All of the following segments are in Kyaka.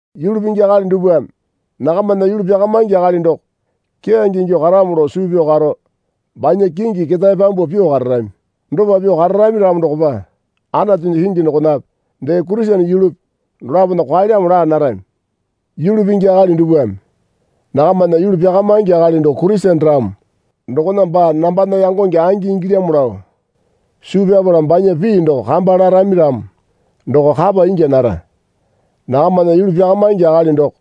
Yulu pingi akali dupwame nakamana yulu pyakamaingi akali doko keyange ingyuo karamo lao suu pyao karo banya kingi ketae pyambuo pyuo kararami. Dopa pyuo kararami ramo dokopa Anatunya kingi dokonape dee Kurisene yulupi dolapona kwaelyamo laa narami. Yulu pingi akali dupwame nakamana yulu pyakamaingi akali doko Kurisene ramo dokona baa nambana yangonge angi ingilyamo lao suu pyapala banya pii doko kamba larami ramo doko kapa ingya nara. Nakamana yulu pyakamaingi akali doko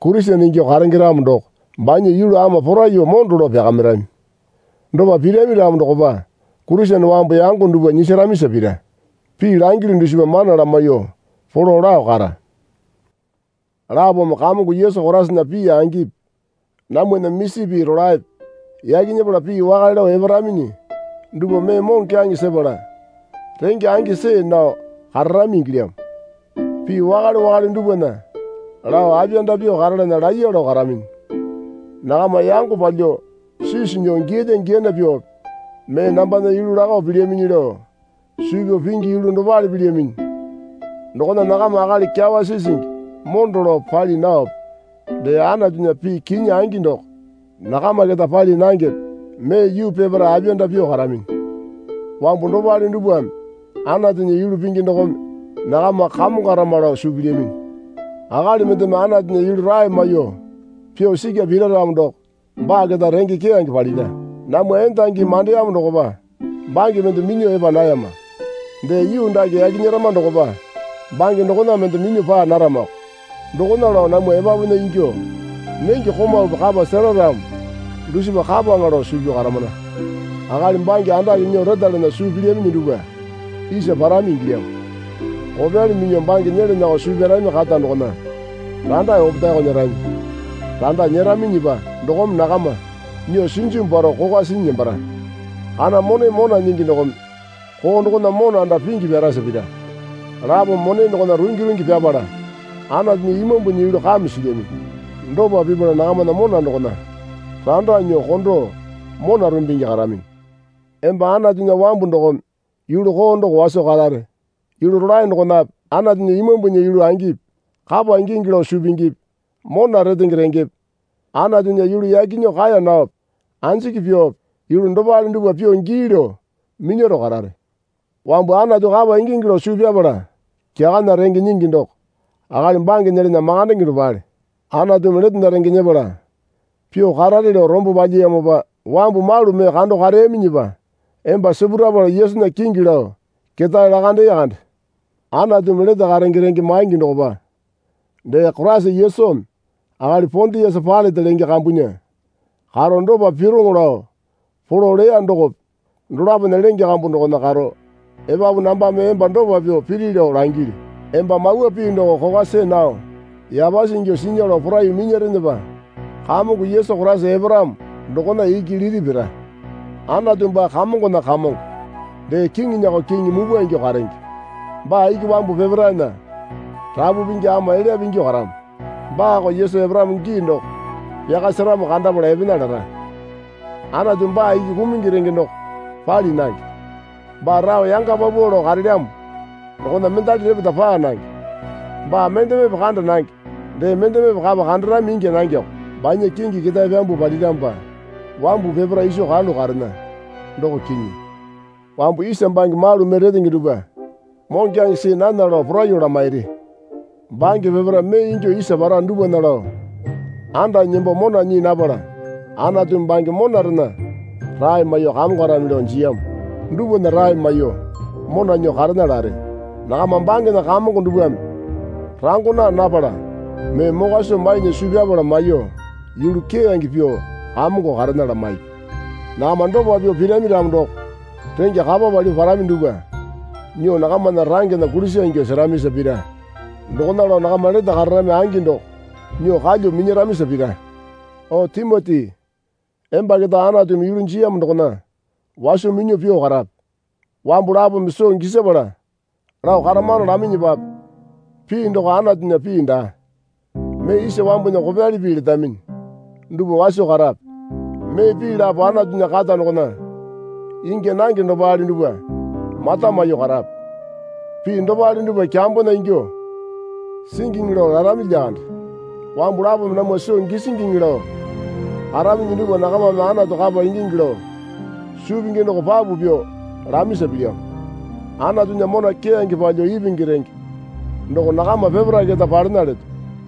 Kurisene ingyuo karenge ramo doko banya yulu ama poraiyuo mondo lao pyakamirami. Dopa pirami ramo dokopa Kurisene wambu yango dupwa nyisaramisa pira. Pii langilyu dusipa mana lamaiyuo polo lao kara. Lapome Kamongo Yesu Koraisana pii angipi namwana misi pii rolaepe yaki nyepala pii wakale lao eparaminyi dupwa mee moŋokyaŋe sepala renge angi see nao kararami ingilyamo. Pii wakale wakale dupwana lao apiyanda pyuo karalana laiya lao karaminyi. Nakama yango palyuo sisi nyuo giyalya giyana pyuope mee nambana yulu lakao pilyaminyi lao suu pyao pingi yulu dopale pilyaminyi. Dokona nakama akali kyawa sisingi mondo lao pali naope dee Anatunya pii kinyi angi doko nakama keta pali nangepe mee yuu peparae apiyanda pyuo karaminyi. Wambu dopale dupwame Anatunya yulu pingi dokome nakama kamongarama lao suu pilyaminyi. Akali mendeme Anatunya yulu rae maiyuo pyuo sikya pira ramo doko baa keta renge keyange palira. Namwa endangimi mandeyamo dokopa bange mende minyuo epa nayama. Dee yuu dake yaki nyerama dokopa bange dokona mende minyuo paa naramako. Dokona lao namwa epapunya ingyuo nenge komaupi kapa sera ramo dusipa kapaŋa lao suu pyao karamana. Akali bange andake nyuo retalana suu pilyaminyi dupwa isa parami ingilyamo. Kopyali minyuo bange nyelanako suu pyarami kata dokona randa opetaeko nyerami. Randa nyeraminyipa dokome nakama nyuo sinjimu paro kokwa sinyi nembara. Kana mone mona nyingi dokome koo dokona mona anda pingi pyarasa pira. Lapome mone dokona rungi rungi pyapala Anatunya Imambunya yulu kame silyaminyi. Dopa pipala nakamana mona dokona randa nyuo kondo mona rumbungi karaminyi. Emba Anatunya wambu dokome yulu koo doko waso karare. Yulu rolae dokonape Anatunya Imambunya yulu angipi kapa ingingi lao suu pingipi mona retenge rengepe Anatunya yulu yaki nyuo kaeya naope anjiki pyuope yulu dopale dupwa pyuo gii lao minyaro karare. Wambu Anatu kapa ingingi lao suu pyapala kyakana renge nyingi doko akali bange nyelana makandenge dopale. Anatumi letena renge nyepala pyuo karare lao rombo palyiyamopa wambu malu mee kando kareyaminyipa emba sipurapala Yesunya kingi lao ketae lakandee kande. Anatumi lete karenge renge maingi dokopa dee Koraisa Yesumi akali Pondiasa Pailate lenge kambunya karo dopa pyuoŋo lao polo leya dokope dolapona lenge kambu dokona karo epapu nambame emba dopa pyuo piri lao langilyu. Emba mawa pii doko kokwa see nao yapasi ingyuo sinya lao poraiyuo minyarenepa Kamongo Yesu Koraisa eparamo dokona iki liti pira. Anatu baa kamongona Kamongo dee kiŋinyako Kiŋi mupwa ingyuo karenge. Baa iki wambu peparaena Rapu Pingi ama elyape ingyuo karamo. Baako Yesu eparamo gii doko pyaka seramo kandapala epena lara. Anatu baa iki kumungi renge doko pali nange. Baa rao yanga paupau lao karelyamo dokona mendali repeta paa nange. Baa mendemepe kanda nange dee mendeme kapa kandarami ingya nangeko. Banya kingi ketae pyambuo paliramopa wambu peparae iso karalu karena, doko kinyi. Wambu isa bange malu mee retenge dupwa moŋokyaŋe see nana lao poraiyuo lamairi. Bange peparae mee ingyuo isa para dupwana lao andanyi nembo mona nyii napala Anatumi bange monarena rae maiyuo kamongarami lao jiyamo dupwana rae maiyuo mona nyuo karena lare. Nakama bangena kamongo dupwame rango naa napala mee mokwa soo mainya suu pyapala maiyuo yulu keyange pyuo kamongo karena lamaipi. Nakama dopa pyuo pirami ramo doko rengya kapa palyuo parami dupwa nyuo nakamana rangena kulisa ingyuo seramisa pira. Dokona lao nakama lete kararami angi doko nyuo kalyuo minyaramisa pira. O Timoti emba keta Anatumi yulu jiyamo dokona waso minyuo pyuo karape. Wambu lapome soo gisapala lao karamano laminyipape pii doko Anatunya pii daa mee isa wambunya kopyali pii letaminyi dupwa waso karape. Mee pii lapo Anatunya kata dokona ingya nange dopale dupwa mata maiyuo karape. Pii dopale dupwa kyambona ingyuo singiŋi lao larami lyakande. Wambu lapome namwa soo gisingiŋi lao karaminyi dupwa nakamame Anatu kapa ingingi lao suu pingi doko papu pyuo lamisa pilyamo. Anatunya mona keyange palyuo ipingi renge doko nakama peparae keta palena leto.